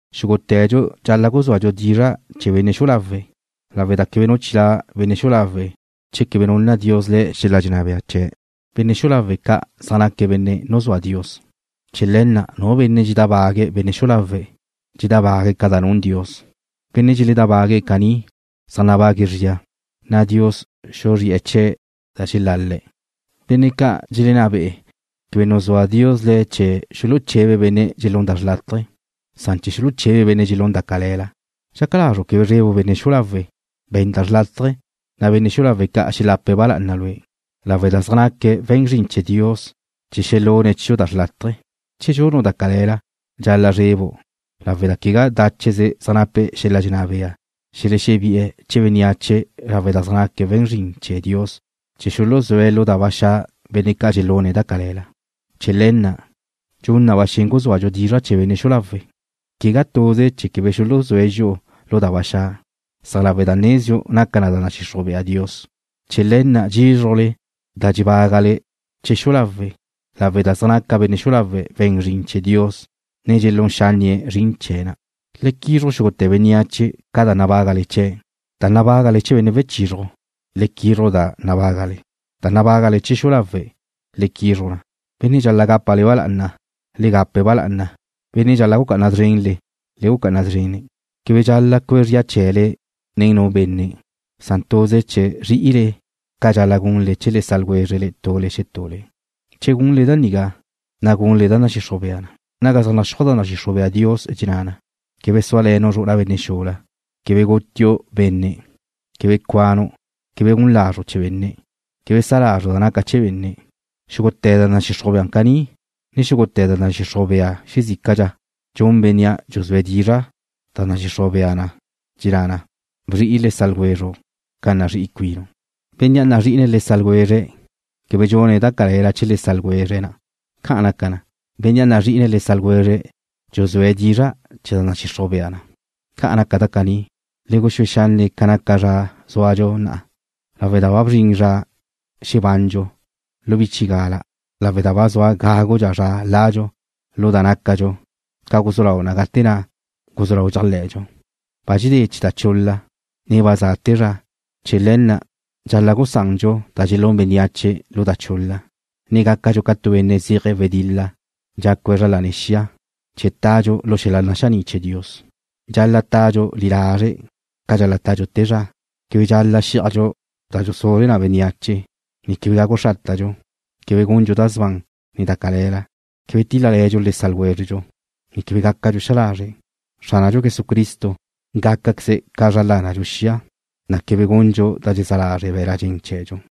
Xúgute̱dxu dxal-la' guzúadxu dizra' chee̱ benne' xu'u lawe', lawe' da quebe nu chilá' benne' xu'u lawe' che quebe nunna Dios le̱' xel-la dxenná bea chee̱'. Benne' xu'u lawe' ca' zaj naque̱' benne' nuzúa Dios. Chee̱ le̱ na' nu benne' dxedábague̱' benne' xu'u lawe' dxedábague̱' ca da nun Dios. Benne' dxeledábague̱' caní zaj nabague̱' zria, na' Dios xuzri'e̱ chee̱' da xexal-le̱'. Benne' ca' dxelenná be'e̱ quebe nuzúa Dios le̱' chee̱ xuluchebe̱' benne' dxelune̱' da xrlátaje, san chee̱ xuluchebe̱' benne' dxelune̱' da cale̱la. ¿Dxaca lazru' quebe zrebu' benne' xu'u lawe'? Be̱n da xrlátaje, na' benne' xu'u lawe' ca' xelape̱' ba lá'ana lue' lawe' da zaj naque̱' we̱n zrin chee̱ Dios chee̱ xelune̱' chiu' da xrlátaje. Che dxunu' da cale̱la, dxal-la' zrebu' lawe' da quegá dácheze zaj nape̱' xel-la dxenná bea xelexebi'e̱ chee̱ bénneache lawe' da zaj naque̱' we̱n zrin chee̱ Dios chee̱ xuluzúe̱' lu da ba xa' benne' ca' dxelune̱' da cale̱la. Chee̱ le̱ na', dxun na ba xen guzúadxu dizra' chee̱ benne' xu'u lawe', quegá tuze chee̱ quebe xuluzúe̱' dxi'u lu da ba xa', san lawe' da nezdxu naca na da nadxixruj bea Dios. Chee̱ le̱ na' dxízrujle da dxebágale chee̱ xu'u lawe', lawe' da zaj naca benne' xu'u lawe' we̱n zrin chee̱ Dios, ne dxelún xánnie̱' zrin chee̱' na'. Le quizruj xúgute̱ bénneache ca da nabágale chee̱'. Da nabágale chee̱ benne' wechizruj, le quizruj da nabágale. Da nabágale chee̱ xu'u lawe', le quizruj na. Benne' dxal-la' gápale ba lá'ana, le gape̱' ba lá'ana. Benne' dxal-la' gucá'ana szrenle, le gucá'ane̱' szren. Quebe dxal-la' cue zria chee̱le nen nu benne' san tuze chee̱ zri'ile le̱' ca dxal-la' gunle chee̱ le sa' ljwézrele tule xetule. Che gunle da nigá, na' gunle da nadxixruj bea na. Naga zaj naxúaj da nadxixruj be'e Dios dxenná na: Quebe súale̱nu' zru'ula benne' xula. Quebe gutiu' benne'. Quebe cuanu'. Quebe gun lazru' chee̱ benne'. Quebe sa lazru' da naca chee̱ benne'. Xúgute̱ da nadxixruj bea caní, ne xúgute̱ da nadxixruj bea xezícadxa dxun bénnea' dxuzúe̱' dizra' da nadxixruj bea na' dxenná na: Bzri'i le sa' ljwezru' ca nazrí'i cuinu'. Bénnea' nazrí'ine̱' le sa' ljwezre̱' quebe dxune̱' da cale̱la chee̱ le sa' ljwezre̱' na'. Ca'an naca, bénnea' nazrí'ine̱' le sa' ljwezre̱' dxuzúe̱' dizra' chee̱ da nadxixruj bea na. Ca naca da caní, le guxúe xanne' ca naca zra zúadxu na'a lawe' da ba bzrin zra xebandxu lu bchigala lawe' da ba zua gágudxa zra ladxu lu da nácadxu ca guzúa na gate na' guzú lau dxéajle̱dxu. Ba dxedé chee̱ da chul-la, ne ba za te zra. Chee̱ le̱ na' dxal-la' gusandxu da dxelún bénneache lu da chul-la, na' gácadxu ca tu benne' zeje̱' wedil-la dxacu zra lane̱' xia, chee̱ tadxu lu xel-la naxaní' chee̱ Dios. Dxal-la' tadxu li lazre' ca dxal-la' tadxu te zra. Quebe dxal-la' xí'ajdxu da dxuzuzre na bénneache, ne quebe gagu xrátadxu. Quebe gundxu da sban, ne da cale̱la. Quebe tíl-lale̱dxu le sa' ljwézredxu, ne quebe gácadxu xa lazre'. Xránadxu Jesucristo gácaqueze̱' ca zra lánadxu xia, na' quebe gundxu da dxezá lazre' be̱la' dxen chee̱dxu.